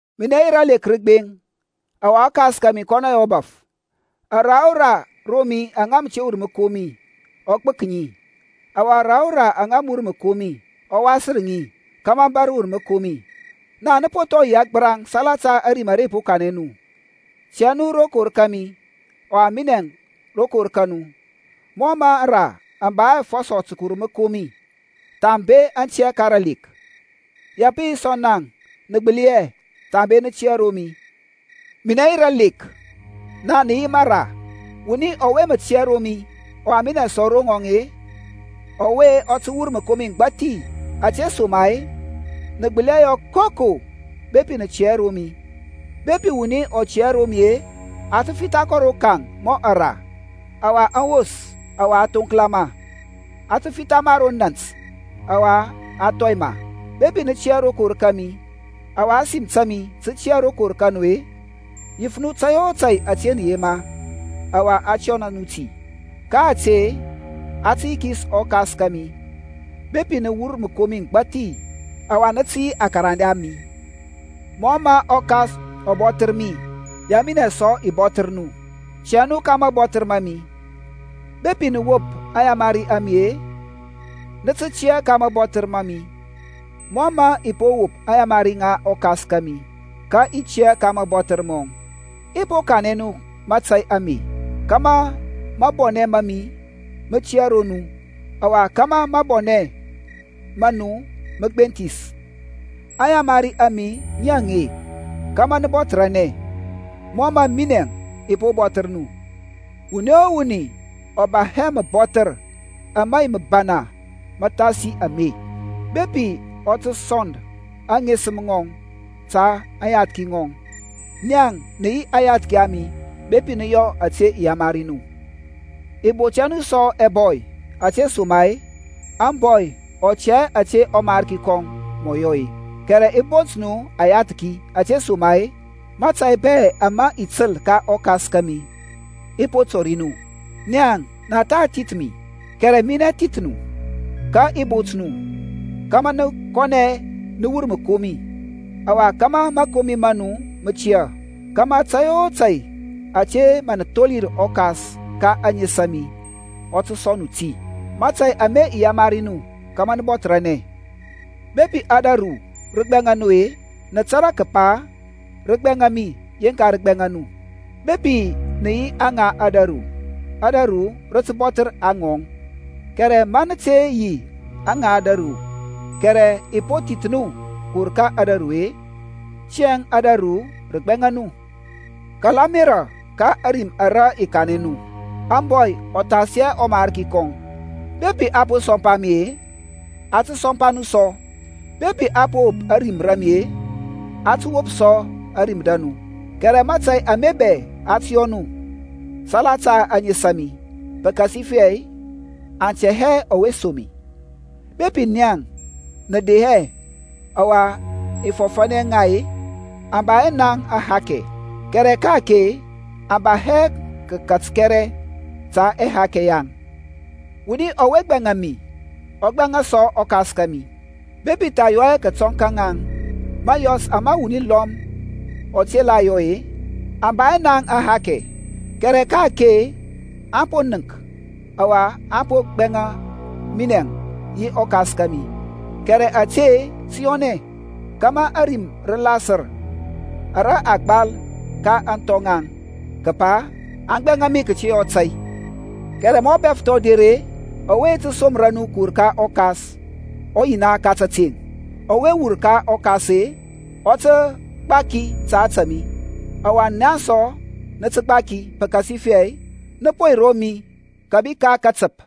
Minɛ yi ralek rəgbeŋ, ɔwa ɔKas kȧmi kɔnɔ yi ɔbaf. Ara o ra ro mi aŋa mə te wur məkomi ɔ gbək ŋi; ɔwa ara o ra aŋa mə wur məkomi, ɔ wasər ŋi, kȧmȧ aŋ bȧr wur məkomi. Naŋ nə po thɔ yi agbəraŋ salata ȧrim ara i po kanɛ nu. Tia nu rokor kȧmi ɔwa minɛŋ rokor ka nu. Mɔ mə aŋra aŋ ba hɛ afɔsɔ tə kəwur məkomi, thambe aŋ tiyȧ ka ralek; ya pə yi sɔ naŋ nə gbəli hɛ, thambe nə tiyȧ ro mi. Minɛ yi ralek, naŋ nə yi mara: wuni ɔwe mə tiyȧ ro mi, ɔwa minɛ sɔ ro ŋɔŋ-e, ɔwe ɔ tə wur məkomi məgbathi: Ȧtesoma-e nə gbəli hɛ yɔ koko bepi nə tiyȧ hɛ ro mi. Bepi wuni ɔ tiyȧ hɛ ro mi-e, a tə fitha kɔ rokaŋ mɔ ara, ɔwa aŋ wos; ɔwa a thoŋkla ma, a fitha ma ro nȧnt ɔwa a thɔi ma. Bepi nə tiyȧ rokor kȧmi, ɔwa ȧsim ta mi tə tiyȧ rokor ka nu-e, yif nu tȧy o tȧy ȧte nə yema, ɔwa a tə yɔna nu ti. Ka ȧte a tə yikis ɔKas kȧmi, bepi nə wur məkomi məgbathi; ɔwa ya nə tə yi akarande a mi. Mɔ mə ɔKas ɔ bɔthər mi, ya minɛ sɔ i bɔthər nu; tiyȧ nu ka mabɔthər ma mi. Bepi nə wop aŋyamari a mi-e, nə tə tiyȧ ka mabɔthər ma mi: mɔ mə i po wop aŋyamari ŋa ɔKas kȧmi, ka i tiya ka mȧbɔthər mɔŋ. I po kanɛ nu mȧtȧy ame, kȧmȧ mabɔnɛ ma mi mə tiyȧ ro nu, ɔwa kȧmȧ mabɔnɛ ma nu mə gbenthis. Aŋyamari a mi ŋi aŋe, Kama nə bɔthərȧnɛ, mɔ mə minɛŋ i po bɔthər nu. Wuni o wuni ɔ ba hɛ məbɔthər ama yi məbana məthasi ame, kəpa ɔ tə sɔnd aŋesəm ŋɔŋ ta aŋyathki ŋɔŋ. Naŋ nə yi aŋyathki a mi, bepi nə yɔ ȧte i yamari nu. I bont hɛ nu sɔ ɛbɔy, ȧtesoma-e ȧŋbɔy ɔ tɛ hɛ ȧte ɔmarki kɔŋ mɔ yɔ-e; kɛrɛ i po bont nu ayathki; ȧtesoma-e mȧtȧy bɛ ama i təl ka ɔKas kȧmi, i po tɔri nu. Naŋ, na tha thith mi, kɛrɛ minɛ thith nu, ka i bot nu, kȧmȧ nə kɔnɛ nə wur məkomi, ɔwa kȧmȧ mȧkomi ma nu mə tiyȧ: kȧmȧ tȧy o tȧy ȧte mə nə tholir ɔKas ka ȧŋes a mi, ɔ tə sɔŋ nu ti. Mȧtȧy ame i yamari nu kȧmȧ nə bɔthərȧnɛ. Bepi ȧdȧru rə gbɛŋa nu-e, nə tȧrȧ kəpa rə gbɛŋa mi yeŋka rə gbɛŋa nu. Bepi nə yi aŋa ȧdȧru, ȧdȧru rə tə bɔthər aŋɔŋ: kɛrɛ ma nə te yi aŋa ȧdȧru, kɛrɛ i po thith nu kəwur ka ȧdȧru-e tiyȧŋ ȧdȧru rə gbɛŋa nu. Kala ȧmerȧ ka ȧrim ara i kanɛ nu, Ȧŋbɔy ɔ thas hɛ ɔmarki kɔŋ. Bepi aŋ po sɔmpa mi-e, aŋ tə sɔmpa nu sɔ; bepi aŋ po wop ȧrim ra mi-e, aŋ tə wop sɔ ȧrim ra nu. Kɛrɛ mȧtȧy ame bɛ aŋ tə yɔ nu salata ȧŋes a mi, pəkasifɛ aŋ tɛ hɛ ɔwe som mi. Bepi naŋ i de hɛ ɔwa i fɔfȧnɛ ŋa-e, aŋ ba hɛ naŋ ahakɛ: kɛrɛ ka-ake aŋ ba hɛ kəkat kɛrɛ ta ɛhakɛ yaŋ. Wuni ɔwe gbɛŋa mi ɔ gbɛŋa sɔ ɔKas kȧmi. Bepi i tha yɔ hɛ kətɔŋ ka ŋaŋ mȧyɔs ama wuni lɔm ɔ te la yɔ-e, aŋ ba hɛ naŋ ahakɛ: kɛrɛ ka-ake aŋ po nənk ɔwa aŋ po gbɛŋa minɛŋ yi ɔKas kȧmi. Kɛrɛ ȧte tə yɔnɛ, kȧmȧ ȧrim rə lasər ara a gbal ka ȧŋthɔ ŋaŋ, kəpa, Aŋ gbɛŋa mi kəte yɔ tȧy. Kɛrɛ ma ɔBɛfəth ɔ der-e, ɔwe i ti somra nu kəwur ka ɔKas, ɔYina ka tȧteŋ, ɔwe wur ka ɔKas-e, ɔ tə gbaki ta ȧtȧ mi: ɔwa naŋ sɔ nə tə gbaki; pəkasifɛ nə po yi ro mi kȧbi ka katəp.